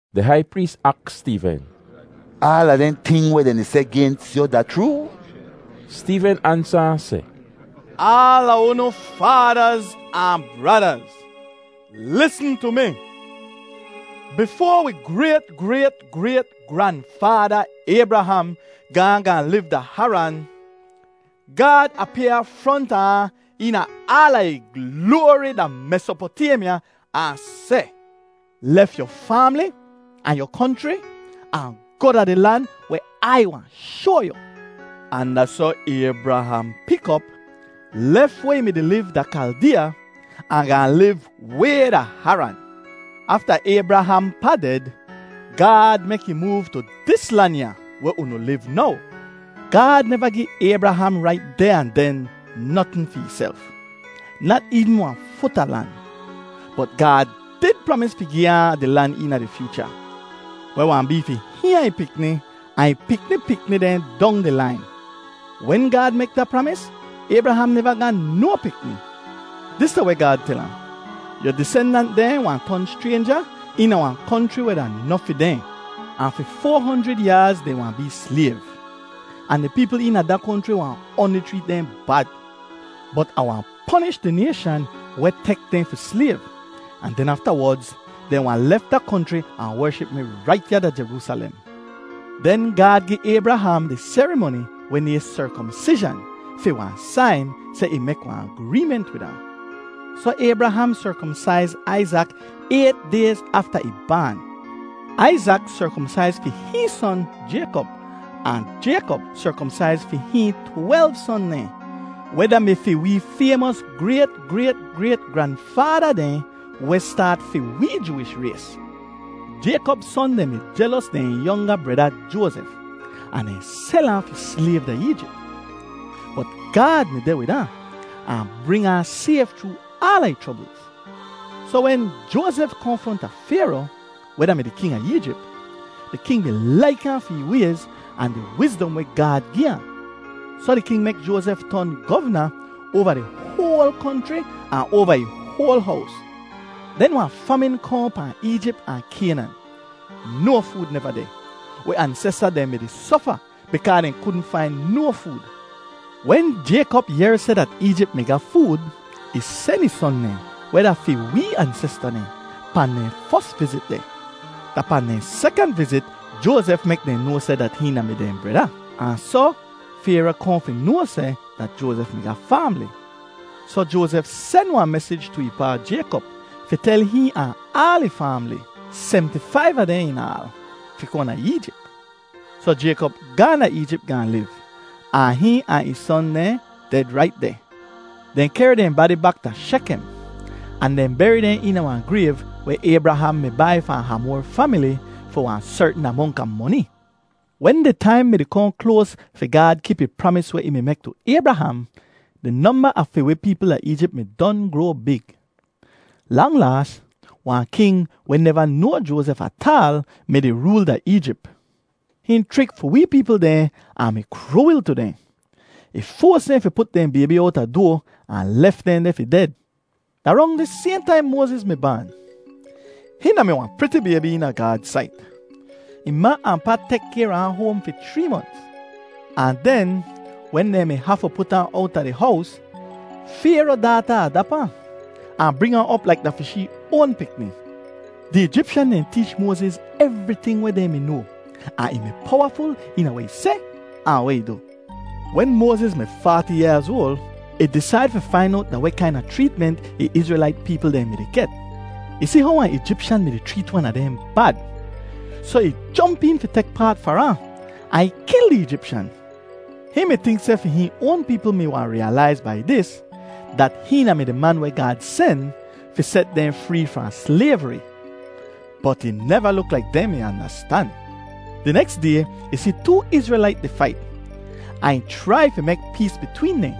Di hai prees aks Steeven, “Aala dehn ting weh dehn di seh gens yu da chroo?” Steeven ansa ahn seh, “Aala unu faadaz ahn bradaz, lisn tu mi. Bifoa wi grayt-grayt-grayt-granfaada Aybraham gaahn gaahn liv da Haran, Gaad apyaa fronta ahn eena aala ih gloari da Mesopotaymya ahn seh, ‘Lef yu faamli ahn yu konchri ahn goh da di lan weh Ai wahn shoa yu.’ “Ahn da soh Aybraham pik op, lef weh ih mi-di liv da Kaldeeya ahn gaahn liv way da Haran. Afta Aybraham pa ded, Gaad mek ih moov tu dis lan ya weh unu liv now. Gaad neva gi Aybraham rait deh ahn den notn fi ihself, nat eevn wahn fut a lan, bot Gaad did pramis fi gi ahn di lan eena di fyoocha weh wahn bee fi hihn ahn ih pikni, ahn ih pikni pikni dehn dong di lain. Wen Gaad mek da pramis, Aybraham neva ga no pikni. Dis da weh Gaad tel ahn: ‘Yu disendant dehn wahn ton schraynja eena wahn konchri weh da noh fi dehn. Ahn fi foa honjrid yaaz dehn wahn bee slayv, ahn di peepl eena da konchri wahn oanli chreet dehn bad. Bot Ah wahn ponish di nayshan weh tek dehn fi slayv, ahn den aftawodz dehn wahn lef da konchri ahn wership mi rait ya da Jeroosalem.’ Den Gaad gi Aybraham di serimoni weh nayhn serkomsizhan fi wahn sain seh ih mek wahn agreement wid ahn. Soh Aybraham serkomsaiz Aizak ayt dayz afta ih baan. Aizak serkomsaiz fi hihn son, Jaykop, ahn Jaykop serkomsaiz fi hihn twelv son dehn, weh da-mi fi wee faymos grayt-grayt-grayt-granfaada dehn weh staat fi wee Jooish rays. “Jaykop son dehn mi jelos dehn yonga breda Joazef, ahn dehn sel ahn fi slayv da Eejip. Bot Gaad mi deh wid ahn, ahn bring ahn sayf chroo aala ih chroblz. Soh wen Joazef kohn fronta Fayro, weh da-mi di king a Eejip, di king mi laik ahn fi ih wayz ahn di wizdom weh Gaad gi ahn. Soh di king mek Joazef ton govna oava di hoal konchri ahn oava ih hoal hows. “Den wahn famin kohn pahn Eejip ahn Kaynan. No food neva deh. Wi ansesta dehn mi-di sofa bikaa dehn kudn fain no food. Wen Jaykop yehr seh dat Eejip mi ga food, ih sen ih son dehn, weh da fi wee ansesta dehn, pahn dehn fos vizit deh. Da pahn dehn sekant vizit, Joazef mek dehn noa seh dat hihn da-mi dehn breda, ahn soh Fayro kohn fi noa seh dat Joazef mi ga faamli. Soh Joazef sen wahn mesij tu ih pa, Jaykop, fi tel hihn ahn aal ih faamli, semti-faiv a dehn in aal, fi kohn da Eejip. Soh Jaykop gaahn da Eejip gaahn liv, ahn hihn ahn ih son dehn ded rait deh. Dehn kehr dehn badi bak da Shekem, ahn dehn beri dehn deh eena wahn grayv weh Aybraham mi bai fahn Hamor famili fi wahn sertn amonk a moni. “Wen di taim mi-di kohn kloas fi Gaad kip ih pramis weh ih mi mek tu Aybraham, di nomba a fi wi peepl da Eejip mi don groa big. Lang laas wahn king weh neva noa Joazef ataal mi-di rool da Eejip. Hihn chrik fi wee peepl dehn ahn mi kruwil tu dehn. Ih foas dehn fi put dehn baybi owta doa, ahn lef dehn deh fi ded. “Da rong dis sayhn taim Moaziz mi baan. Hihn da-mi wahn priti baybi eena Gaad sait. Ih ma ahn pa tek kayr a ahn hoam fi chree monts, ahn den wen dehn mi hafu put ahn owta di hows, Fayro daata adap ahn, ahn bring ahn op laik da fi shee oan pikni. Di Eejipshan dehn teech Moaziz evriting weh dehn mi noa, ahn ih mi powaful eena weh ih seh ahn weh ih du. “Wen Moaziz mi faati yaaz oal, ih disaid fi fain owt da weh kaina chreetment ih Izrelait peepl dehn mi-di get. Ih si how wahn Eejipshan mi-di chreet wan a dehn bad, soh ih jomp een fi tek paat far ahn, ahn ih kil di Eejipshan. Hihn mi tink seh fi hihn oan peepl mi wahn riyalaiz bai dis dat hihn da-mi di man weh Gaad sen fi set dehn free fahn slayvri. Bot ih neva luk laik dehn mi andastan. Di neks day ih si too Izrelait di fait, ahn ih chrai fi mek pees bitween dehn.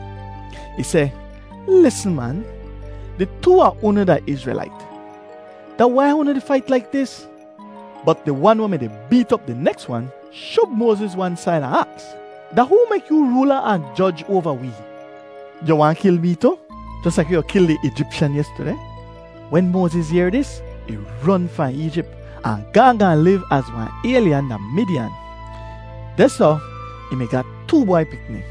Ih seh, ‘Lisn man, di too a unu da Izrelait. Da wai unu di fait laik dis?’ “Bot di wan weh mi-di beet op di neks wan shub Moaziz wan said ahn aks, ‘Da hoo mek yoo roola ahn joj oava wee? Yu waahn kil mee tu, jos laik how yu kil di Eejipshan yestudeh?’ Wen Moaziz yehr dis, ih ron fahn Eejip ahn gaahn gaahn liv az wahn aylyan da Midiyan. Dehsoh ih mi ga too bwai pikni.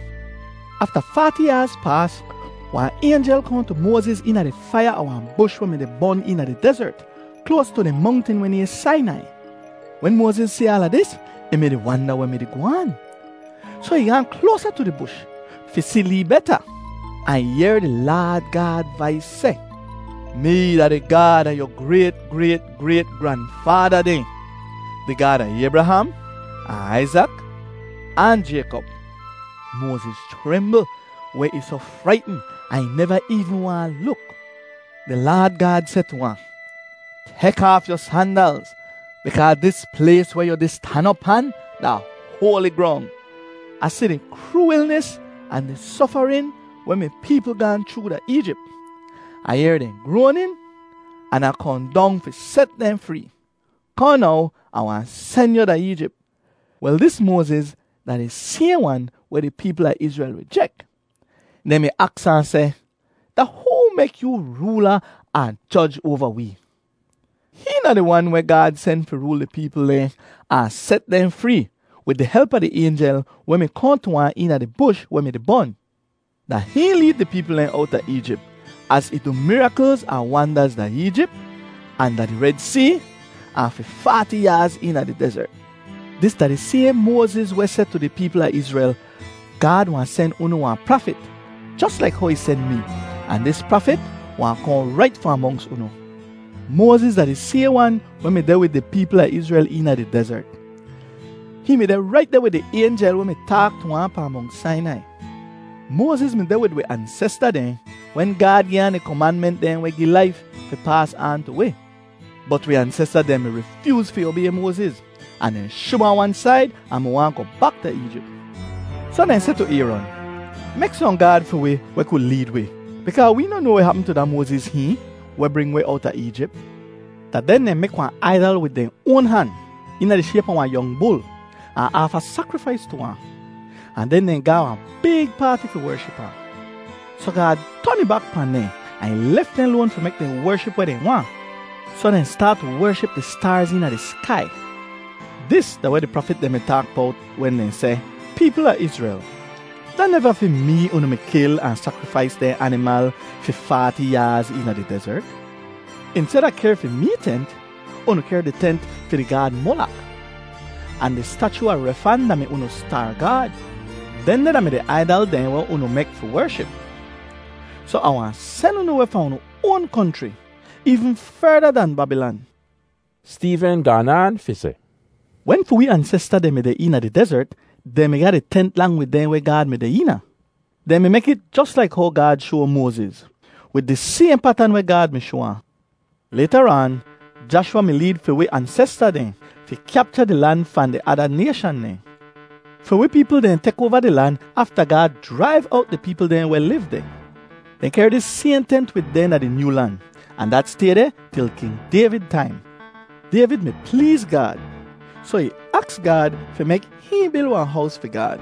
“Afta faati yaaz paas, wahn aynjel kohn tu Moaziz eena di faiya a wahn bush weh mi-di bon eena di dezert kloas tu di mongtin weh nayhn Sainai. Wen Moaziz si aala dis, ih mi-di wanda weh mi-di goh aan. Soh ih gaahn kloasa tu di bush fi si lee beta ahn ih yehr di Laad Gaad vais seh, ‘Mee da di Gaad a yu grayt-grayt-grayt-granfaada dehn, di Gaad a Aybraham ahn Aizak ahn Jaykop.’ Moaziz chrimbl weh ih soh fraitn ahn ih neva eevn waahn luk. “Di Laad Gaad seh tu ahn, ‘Tek aaf yu sandalz bikaa dis plays weh yu di stan op pan da hoali grong. Ah si di kruwilnis ahn di sofarin weh mi peepl gaahn chroo da Eejip. Ah yehr dehn groanin an Ah kohn dong fi set dehn free. Kohn now, Ah wahn sen yu da Eejip.’ “Wel, dis Moaziz da di sayhn wan weh di peepl a Izrel rijek. Dehn mi aks ahn seh, ‘Da hoo mek yoo roola ahn joj oava wee?’ Hihn da di wan weh Gaad sen fi rool di peepl dehn ahn set dehn free wid di help a di aynjel weh mi kohn tu ahn eena di bush weh mi-di bon. Da hihn leed di peepl dehn owta Eejip az ih du miraklz ahn wandaz da Eejip, ahn da di Red See, ahn fi faati yaaz eena di dezert. “Dis da di sayhn Moaziz weh seh tu di peepl a Izrel, ‘Gaad wahn sen unu wahn prafit, jos laik how ih sen mee, ahn dis prafit wahn kohn rait fahn monks unu.’ Moaziz da di sayhn wan weh mi deh wid di peepl a Izrel eena di dezert. Hihn mi deh rait deh wid di aynjel weh mi taak tu ahn pahn Mongt Sainai. Moaziz mi deh wid wi ansesta dehn wen Gaad gi ahn di komanment dehn weh gi laif fi paas aan tu wi. “Bot wi ansesta dehn mi rifyooz fi obay Moaziz, ahn dehn shub ahn wan said ahn mi waahn goh bak da Eejip. Soh dehn seh tu Ayron, ‘Mek sohn gaad fi wi weh ku leed wi bikaa wee noh noa weh hapm tu da Moaziz hihn, weh bring wi owta Eejip.’ Da den dehn mek wahn aidal wid dehn oan han eena di shayp a wahn yong bul ahn aafa sakrifais tu ahn, ahn den dehn ga wahn big paati fi wership ahn. Soh Gaad ton ih bak pahn dehn ahn ih lef dehn loan fi mek dehn wership weh dehn waahn. Soh dehn staat tu wership di staarz eena di skai. Dis da weh di prafit dehn di taak bowt wen dehn seh: ‘Peepl a Izrel, da neva fi mee unu mi kil ahn sakrifais dehn animal fi faati yaaz eena di dezert. Insteda kehr fi mee tent, unu kehr di tent fi di gaad Molok, ahn di stachu a Refan da-mi unu staar gaad. Dehndeh da-mi di aidal dehn weh unu mi mek fi wership. Soh Ah wahn sen unu weh fahn unu oan konchri,’ eevn ferda dan Babilan.” Steeven gaan aan fi seh, “Wen fi wee ansesta dehn mi deh eena di dezert, dehn mi ga di tent lang wid dehn weh Gaad mi deh eena. Dehn mi mek it jos laik how Gaad shoa Moaziz, wid di sayhn patan weh Gaad mi shoa ahn. Laytaraan, Jashwa mi leed fi wi ansesta dehn fi kyapcha di lan fahn di ada nayshan dehn. Fi wee peepl dehn tek oava di lan afta Gaad jraiv owt di peepl dehn weh liv deh. Dehn kehr dis sayhn tent wid dehn da di nyoo lan, ahn dat stay deh til King Dayvid taim. Dayvid mi pleez Gaad, soh ih aks Gaad fi mek hihn bil wahn hows fi Gaad.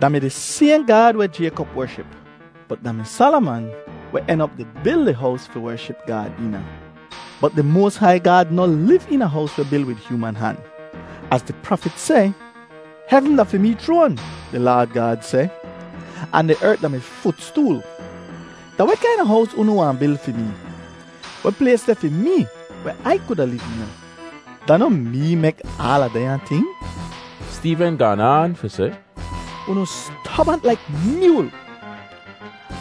Da mi di sayhn Gaad weh Jaykop wership. Bot da mi Salaman weh en op di bil di hows fi wership Gaad eena. “Bot di moas hai Gaad noh liv eena hows weh bil wid hyooman han. Az di prafit seh, ‘Hevn da fi mee chroan,’ di Laad Gaad seh, ‘Ahn di ert da mi futstool. Da weh kaina hows unu wahn bil fi mee? Weh plays deh fi mee weh Ai kuda liv eena? Da noh mee mek aala dehnya ting?’” Steeven gaan aan fi seh, “Unu stobant laik myool,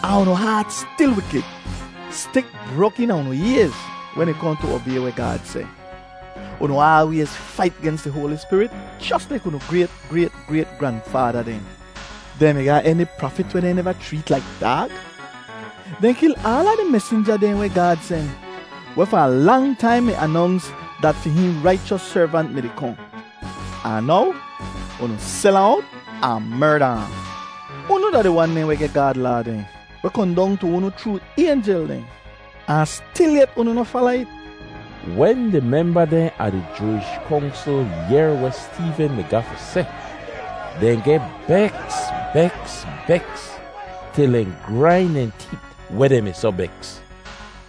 ahn unu haat stil wikid. Stik brok eena unu ayz wen ih kohn tu obay weh Gaad seh. Unu aalwayz fait gens di Hoali Spirit jos laik unu grayt-grayt-grayt-granfaada dehn. Dehn mi ga eni prafit weh dehn neva chreet laik daag? Dehn kil aala di mesinja dehn weh Gaad sen, weh fahn lang taim mi anonks dat fi hihn Raichos Servant mi-di kohn. Ahn now unu sel ahn owt ahn merda ahn. Unu da di wan dehn weh geh Gaad Laa dehn weh kohn dong tu unu chroo aynjel dehn, ahn stilyet unu noh fala it!” Wen di memba dehn a di Jooish Kongsl yehr weh Steeven mi ga fi seh, dehn geh beks, beks, beks til dehn grain dehn teet weh dehn mi soh beks.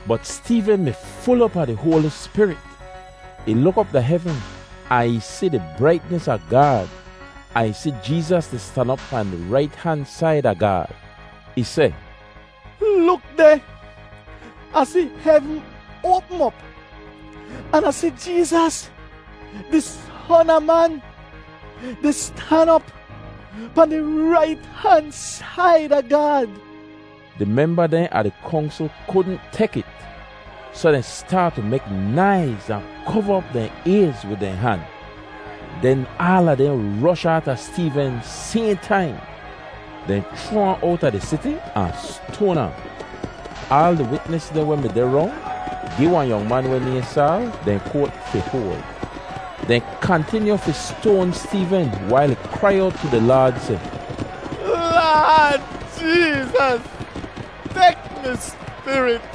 Bot Steeven mi ful op a di Hoali Spirit. Ih luk op da hevn ahn ih si di braitnis a Gaad ahn ih si Jeezas di stan op pahn di rait han said a Gaad. Ih seh, “Luk deh! Ah si hevn oapm op an Ah si Jeezas, di Son a Man, di stan op pahn di rait han said a Gaad.” Di memba dehn a di Kongsl kudn tek it, soh dehn staat tu mek naiz ahn kova op dehn ayz wid dehn han. Den aala dehn rosh aata Steeven sayhn taim. Dehn chroa ahn owta di siti ahn stoan ahn. Aal di witnis dehn weh mi deh rong gi wahn yong man weh nayhn Saal dehn koat fi hoal. Dehn kantinyu fi stoan Steeven wail ih krai owt tu di Laad seh, “Laad Jeezas, tek mi spirit!”